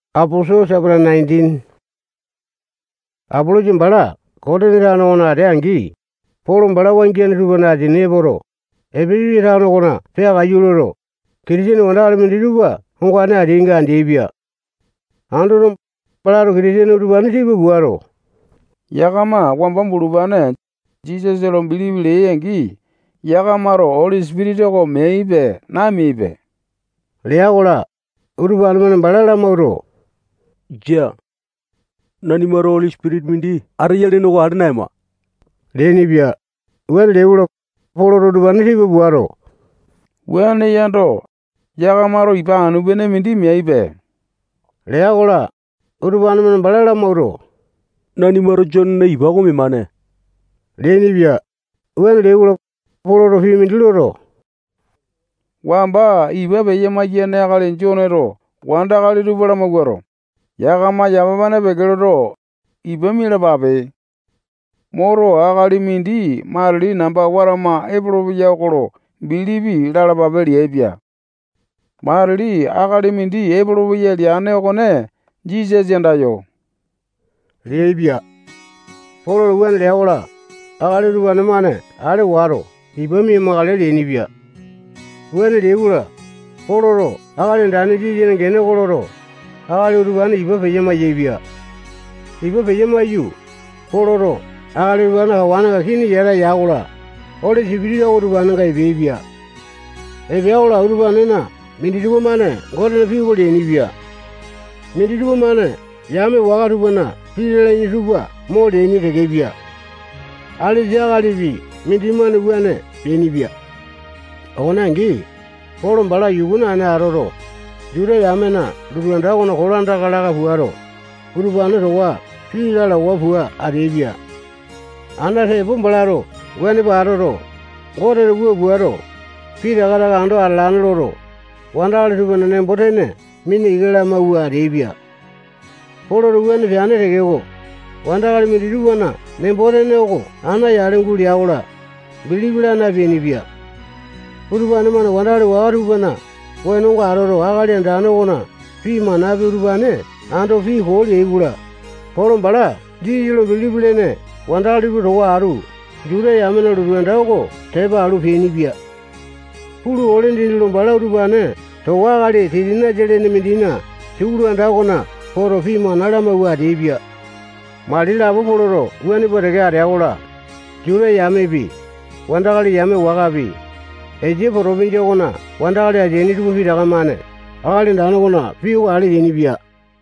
Apolosa bala Kotini tano okona atea-angi, Polo bala wangiane tupana asini epoto, Epesasa tano okona peakaiyu loto, Kitisene wandakali minditupa ongane ateainga andeaipia. Andoto, balato Kitisene utupane tipa puato, yakama wamba bulupane Jisasa lo bilipi leai-angi, yakamato Oli Sipitisa oko meaipe, nameaipe lea-kola, utupane-mane bala lamawuato, jia. Nanimato Oli Sipitisa mindi ateya lene oko ale naema leainipia. Wuane leai-kola, Poloto utupane tipa puato, wuane yando, yakamato ipa anu-pene mindi meaipe lea-kola, utupane-mane bala lamawuato, nanimato Jonena ipa oko memane leainipia. Wuane leai-kola, Poloto pii mindi loto, wamba ipa peya-maiyane akali Joneto wandakali tupa lamawuato, yakama yamapane peke loto, ipa mialapape. Moto, akali mindi matili namba watama epolopeya oko lo bilipi lalapape leaipia. Matili akali mindi epolopeya leane okone Jisasa andayo leaipia. Poloto wuane lea-kola, akali utupane-mane ale wato ipa mia-makale leainipia. Wuane leai-kola, Poloto Akali Andane Jisasana gene oko loto, akali utupane ipa peya-maiyaepia. Ipa peya maiyu, Poloto akali utupanena kawanenga kini yata ya-kola, Oli Sipitisa oko utupanenga epeaipia. Epea-kola, utupanena minditupa-mane Gotena pii oko leainipia. Minditupa-mane yame waka tupana pii lalaini tupa mo leaini tekepia. Alesa akalipi mindimane wuane peainipia. Okone angi, Polo bala yuku naene atoto, Juta yamena lotu anda okona kolandaka laka puato, utupane towa pii lalawa pua ateaipia. Ana tepo balato wuane pua atoto, Goteto wua puato, pitaka taka ando atalane loto, wandakali tupana nembo-tene mina ika lamawua ateaipia. Poloto wuane peane tekeko, wandakali minditupana nembo-tene oko ana yale gulea-kola, bilipi laa napeainipia. Utupane-mane wandakali waka tupana wenonga atoto, Akali Andane okona pii manapi, utupane ando pii koo leai-kola, Polo bala Jisasa lo bilipi lene wandakali tupa towa atu Juta yamena lotu anda oko tepa alu peainipia. Pulu, ole dindi lo bala utupane towa akali Titanasa lene mindina sukulu anda okona poto, pii mana lamawua ateaipia. Mali lapo Poloto wuane pua teke atea-kola, Juta yamepi, wandakali yame wakapi, Esia potopinjia okona wandakali ateaini tupa pitaka-mane Akali Andane okona pii oko ale yainipia.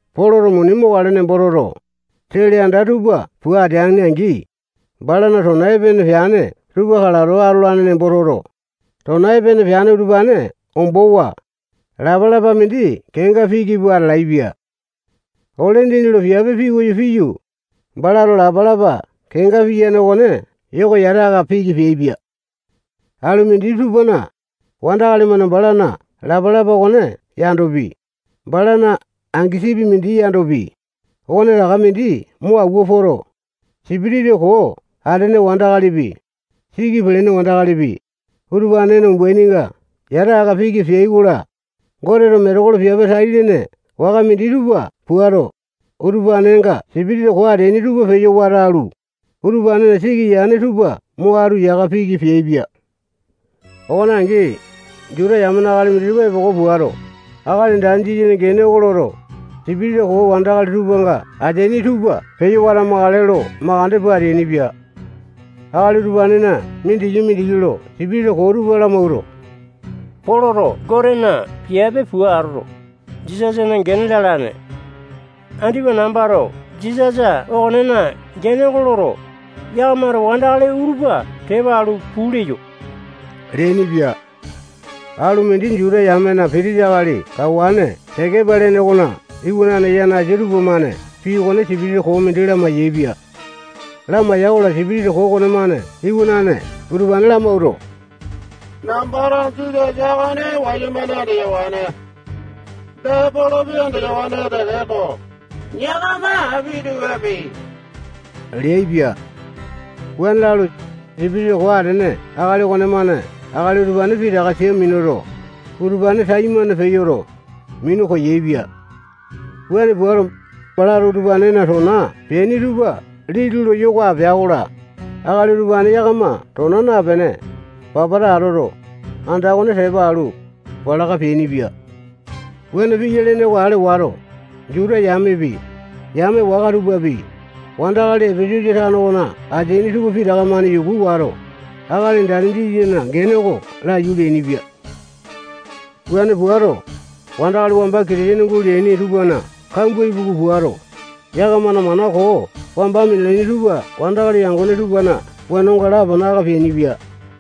Poloto muni mokale nembo toto, sele anda tupa pua ateane-angi, balana tona epene peane tupa kalato atolane nembo toto, tona epene peane utupane ombowa, lapalapa mindi kenga piki pua atalaepia. Ole dindi lo piape pikoyo piyu, balato lapalapa kenga piyane okone yoka yata aka piki peaipia. Alu mindi tupana, wandakali-mane balana lapalapa okone yandopi, balana angasipi mindi yandopi, okonetaka mindi mo awua poto, sipitisa koo atene wandakalipi, siki pelene wandakalipi, utupanena umbaininga yata aka piki peai-kola, Goteto metekolo piape tai-lene waka minditupa puato, utupanenga sipitisa koo ateaini tupa peyo wata alu, utupanena siki yane tupa mo atu yaka piki peaipia. Okone angi, Juta yamena akali minditupa epoko puato, Akali Andane Jisasana gene oko loto, sipitisa koo wandakali tupanga ateaini tupa peyo watamakale lo makande pua ateainipia. Akali utupanena mindiki-mindiki lo sipitisa koo tupa lamawuato, Poloto Gotena piape pua atoto, Jisasana gene lalane. Andipa nambato Jisasa okonena gene oko loto, yakamato wandakali utupa tepa alu puu leyo leainipia. Alu mindi Juta yamena pitisa akali kawane Sekepa lene okona iwanane yanasa tupamane pii okone sipitisa koo mindi lamai-yaepia. Lamai-yaikola, sipitisa koo okonemane iwanane utupane lamawuato, nambato Jisasa okone wayumane andeyawane. Dee, Polopi andeyawane tekeko, yakama api tupape leaipia. Wuane lalu, sipitisa koo atene akali okonemane akali utupane pitaka sia minuto, utupane taimane peyoto, minu koyaepia. Wuane puato, balato utupanena tona peaini tupa liti lo yoko apea-kola, akali utupane yakama tona napene, papata atoto, anda okone tepa alu, palaka peainipia. Wuane piya lene oko ale wato, Juta yamepi, yame waka tupapi, wandakali Epesasa tano okona ateaini tupa pitaka-mane yuku wato, Akali Andane Jisasana gene oko laiyu leainipia. Wuane puato, wandakali wamba Kitisene guleaini tupana kambua ipuku puato, yakamana mana koo wamba minalaini tupa wandakali yangone tupana wenonga lapana aka peainipia.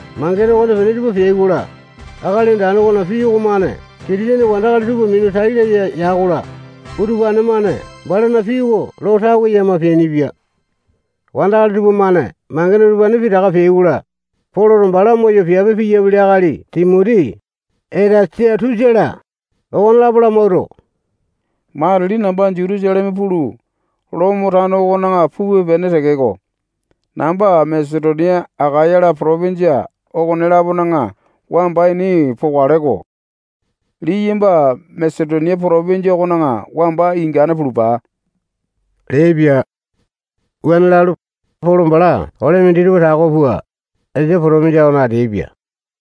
Mangene okonepene tupa peai-kola, Akali Andane okona pii okomane Kitisene wandakali tupa minu tai laya ya-kola, utupane-mane balana pii oko lo tawe yama peainipia. Wandakali tupamane mangene utupane pitaka peai-kola, Poloto bala moyo piape piyapili akali Timoti, Etasatusa-la, okonelapo lamawuato, matili namba Jutusaleme pulu, Lomo tano okona pupe-pene tekeko, namba Masetonia, Akaya-la, potopinjia okone-lapona wamba ini pokale-ko. Liyamba Masetonia potopinjia okona wamba ingane pulupa leaipia. Wuane lalu, Polo bala ole minditupa tako pua, Esia potopinjia okona ateaipia.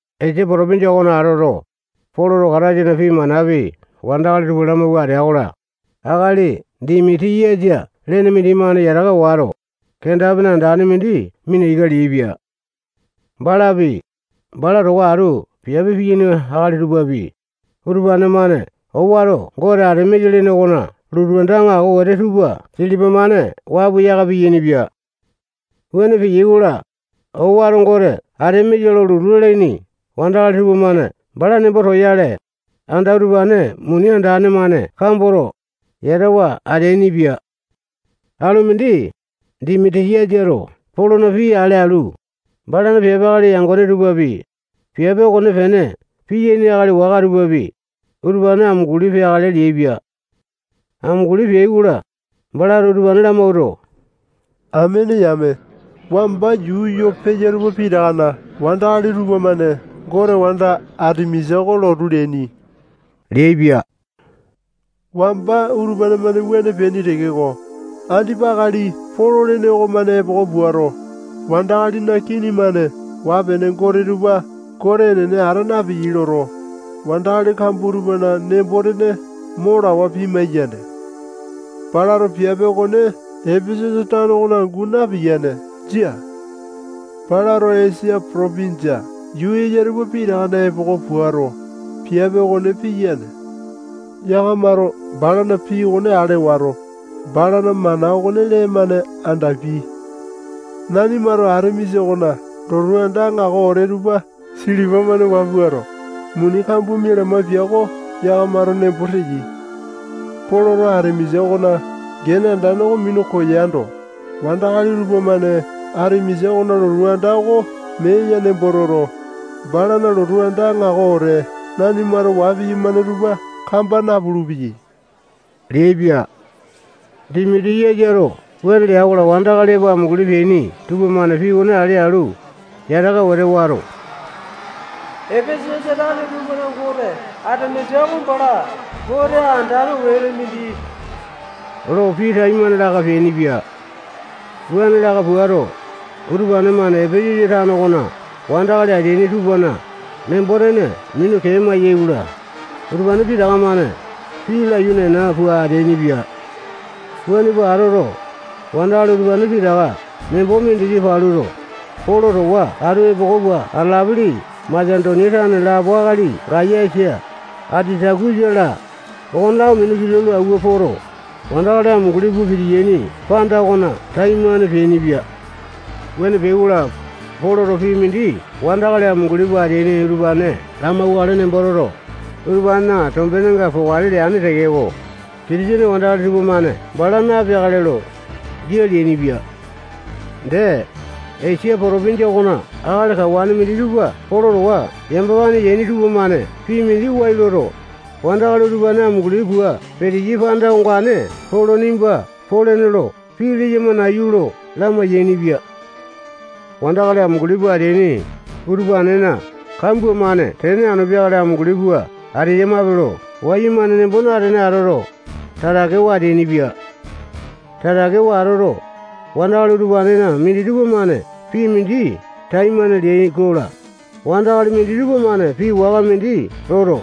Esia potopinjia okona atoto, Poloto Kataisana pii manapi wandakali tupa lamawua atea-kola, akali Dimiti-yasa lene mindimane yataka wato, kenda-pene andane mindi mina ika leaipia. Balapi, bala towa atu piape piyaini akali tupapi, utupane-mane owato gote Atemisa lene okona lotu anda aŋako wete tupa silipa-mane waa pua yaka piyainipia. Wuane peyai-kola, owato gote Atemisa lo lotu leaini wandakali tupamane bala nembo toyale, anda utupane muni andane-mane kamboto, yatawa ateainipia. Alu mindi, Dimiti-yasato Polona pii ale alu, balana piape akali yangone tupapi, piape okonepene piyaini akali waka tupapi, utupane amunguli peakale leaipia. Amunguli peai-kola, balato utupane lamawuato, amene yame, wamba yuu yoo peya tupa pitakana wandakali tupamane gote wanda Atemisa oko lotu leaini leaipia. Wamba utupane-mane wuane peaini tekeko, andipa akali Polo lene okomane epoko puato, wandakalina kini-mane waa-pene gote tupa gote enene ata napeyai loto, wandakali kambua tupana nembo-tene mo lawa pimai-yane. Balato piape okone Epesasa tano okona angu napiyane. Jia. Balato Esia potopinjia yuu eya tupa pitakana epoko puato, piape okone piyane. Yakamato balana pii okone ale wato, balana mana okone lee-mane andapiai. Nanimato Atemisa okona lotu anda aŋako wete tupa silipa-mane waa puato, muni kambua mialamae pia oko yakamato nembo teyai. Poloto Atemisa okona gene andane oko minu koyando, wandakali tupamane Atemisa okona lotu anda oko mee ya nembo toto, balana lotu anda aŋako wete nanimato waa piyamane tupa kamba napulu-peyai leaipia. Dimiti-yasato wuane lea-kola, wandakali epo amunguli peaini tupamane pii okone ale alu, yataka wete wato, Epesasa tane tupana gote Atemisa oko bala gote andane wete mindi lo pii taimane laka peainipia. Wuane laka puato, utupane-mane Epesasa tano okona wandakali ateaini tupana nembo-tene minu kee amai-yaikola, utupane pitaka-mane pii laiyu nena pua ateainipia. Wuane pua atoto, wandakali utupane pitaka nembo mindiki paluto, Polo towa atu epoko pua atalapili Masetonia tane lapo akali Gayasa, Atitakusa-la, okonelapo minu kilau lo awua poto, wandakali amunguli pua pitiyaini panda okona taimane peainipia. Wuane peai-kola, Poloto pii mindi wandakali amunguli pua ateaini utupane lamauwakale nembo toto, utupanena tombenenga pokale leane tekeko, Kitisene wandakali tupamane bala napeakale lo, jia leainipia. Dee, Esia potopinjia okona akali kawane minditupa Polo towa yamapane yaini tupamane pii mindi wai loto, wandakali utupane amunguli pua peteyai panda ongane Polo nimba polene lo pii leyama nayu lo lamai-yainipia. Wandakali amunguli pua ateaini utupanena kambua-mane tene anu peakale amunguli pua ateyamape lo wayumane nembo natene atoto, tatakewa ateainipia. Tatakewa atoto, wandakali utupanena minditupa-mane pii mindi taimane leai-kola, wandakali minditupa-mane pii waka mindi loto,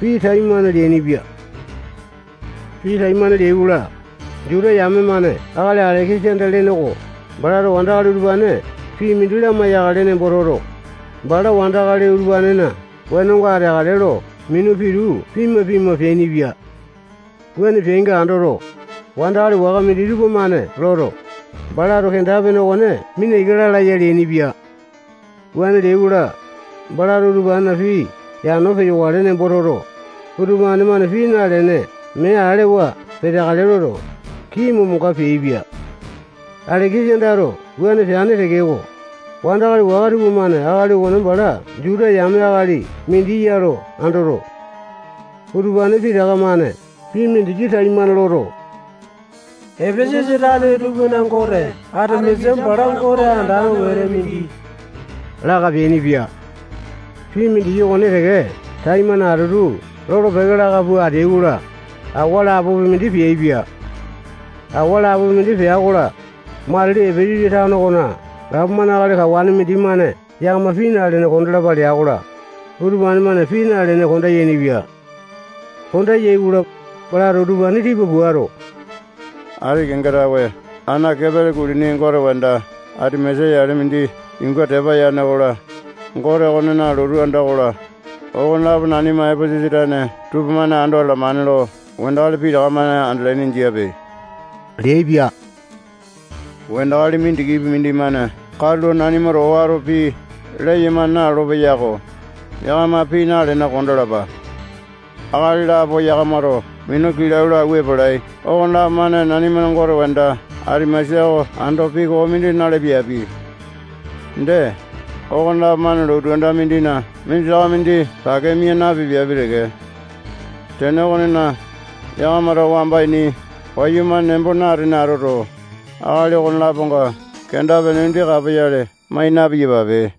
pii taimane leainipia. Pii taimane leai-kola, Juta yame-mane akali Aleke-sanda lene oko balato wandakali utupane pii mindi lamai-yakale nembo toto, bala wandakali utupanena wenonga ateakale lo minu pitu pima-pima peainipia. Wuane peainga andoto, wandakali waka minditupa-mane loto, balato kenda-pene okone mina ika lala ya leainipia. Wuane leai-kola, balato utupanena pii yano peyokale nembo toto, utupane-mane pii nalene mee alewa peteakale loto, kii momonga peaipia. Aleke-sandato wuane peane tekeko, wandakali waka tupamane akali okone bala Juta yame akali mindi ya lo andoto, utupane pitaka-mane pii mindiki taimane loto, Epesasa tane tupana gote Atemisa bala gote andane wete mindi laka peainipia. Pii mindiki okone teke taimane atutu lolo-peke laka pua ateai-kola, awa lapopi mindi peaipia. Awa lapopi mindi pea-kola, matili Epesasa tano okona gapomane akali kawane mindimane yakama pii nalene kondalapa lea-kola, utupane-mane pii nalene konda yainipia. Konda yai-kola, balato utupane tipa puato, ati kenga tawe ana kepele kulini gote wanda Atemisa yale mindi yuunga tepa yane okola, gote okonena lotu anda okola, okonelapo nanima Epesasa tane tupamane ando atalamane lo wandakali pitaka-mane andalaini jiape leaipia. Wandakali mindikipi mindimane katulo nanimato owato pii leyama nalolo-peyako, yakama pii nalene kondalapa. Akali lapo yakamato minu kilau lo awua epalai okonelapo-mane nanimana gote wanda Atemisa oko ando pii koo mindi na-lapiapi. Dee, okonelapo-mane lotu anda mindina minditaka mindi pake mia napipiapi teke. Tene okonena, yakamato wamba ini wayumane nembo natene atoto, akali okone-laponga kenda-pene mindi kapoyale mai na-piyapape.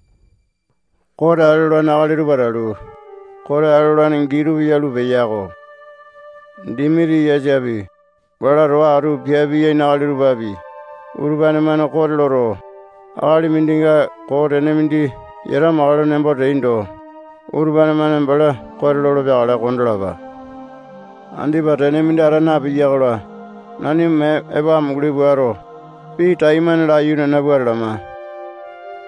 Kote ale olane akali tupa atalu, kote ale olane gii tupa yalu peya-ko. Dimiti-yasapi, bala towa atu piape piyaini akali tupapi, utupane-mane kote loto, akali mindinga koo tene mindi yata amakale nembo teaindo, utupane-mane bala kote lolo peakale kondalapa. Andipa tene mindi ata napiya-kola, nanima mee epo amunguli puato, pii taimane laiyu nena pua atalama.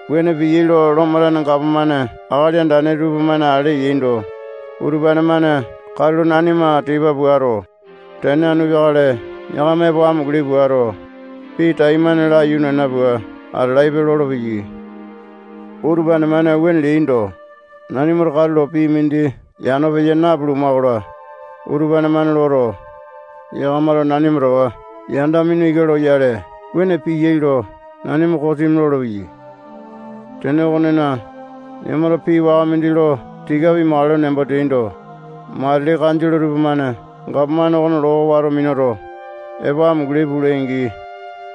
Wuane piyai lo Lomo tane gapomane akali andane tupamane ale yaindo, utupane-mane katulo nanima tipa puato, tene anu peakale yakama epo amunguli puato, pii taimane laiyu nena pua atalaipe lolopeya. Utupane-mane wuane leaindo, nanimato katulo pii mindi yano peya napuluma-kola, utupane-mane loto, yakamato nanima towa yanda mina ika loyale wuane piyai lo nanima kosimi lolopeyai. Tene okonena, yakamato pii waka mindi lo tika pimakale nembo teaindo, matili kanjole tupamane gapomane okona loo oko wato minuto, epo amunguli pulai-angi,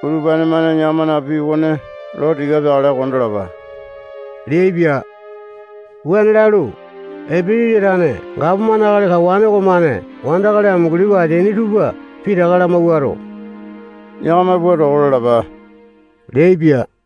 utupane-mane yakamana pii okone lo tika peakale kondalapa leaipia. Wuane lalu, Epesasa tane gapomane akali kawane okomane wandakali amunguli pua ateaini tupa pitaka lamawuato, yakama puu toko lalapa leaipia.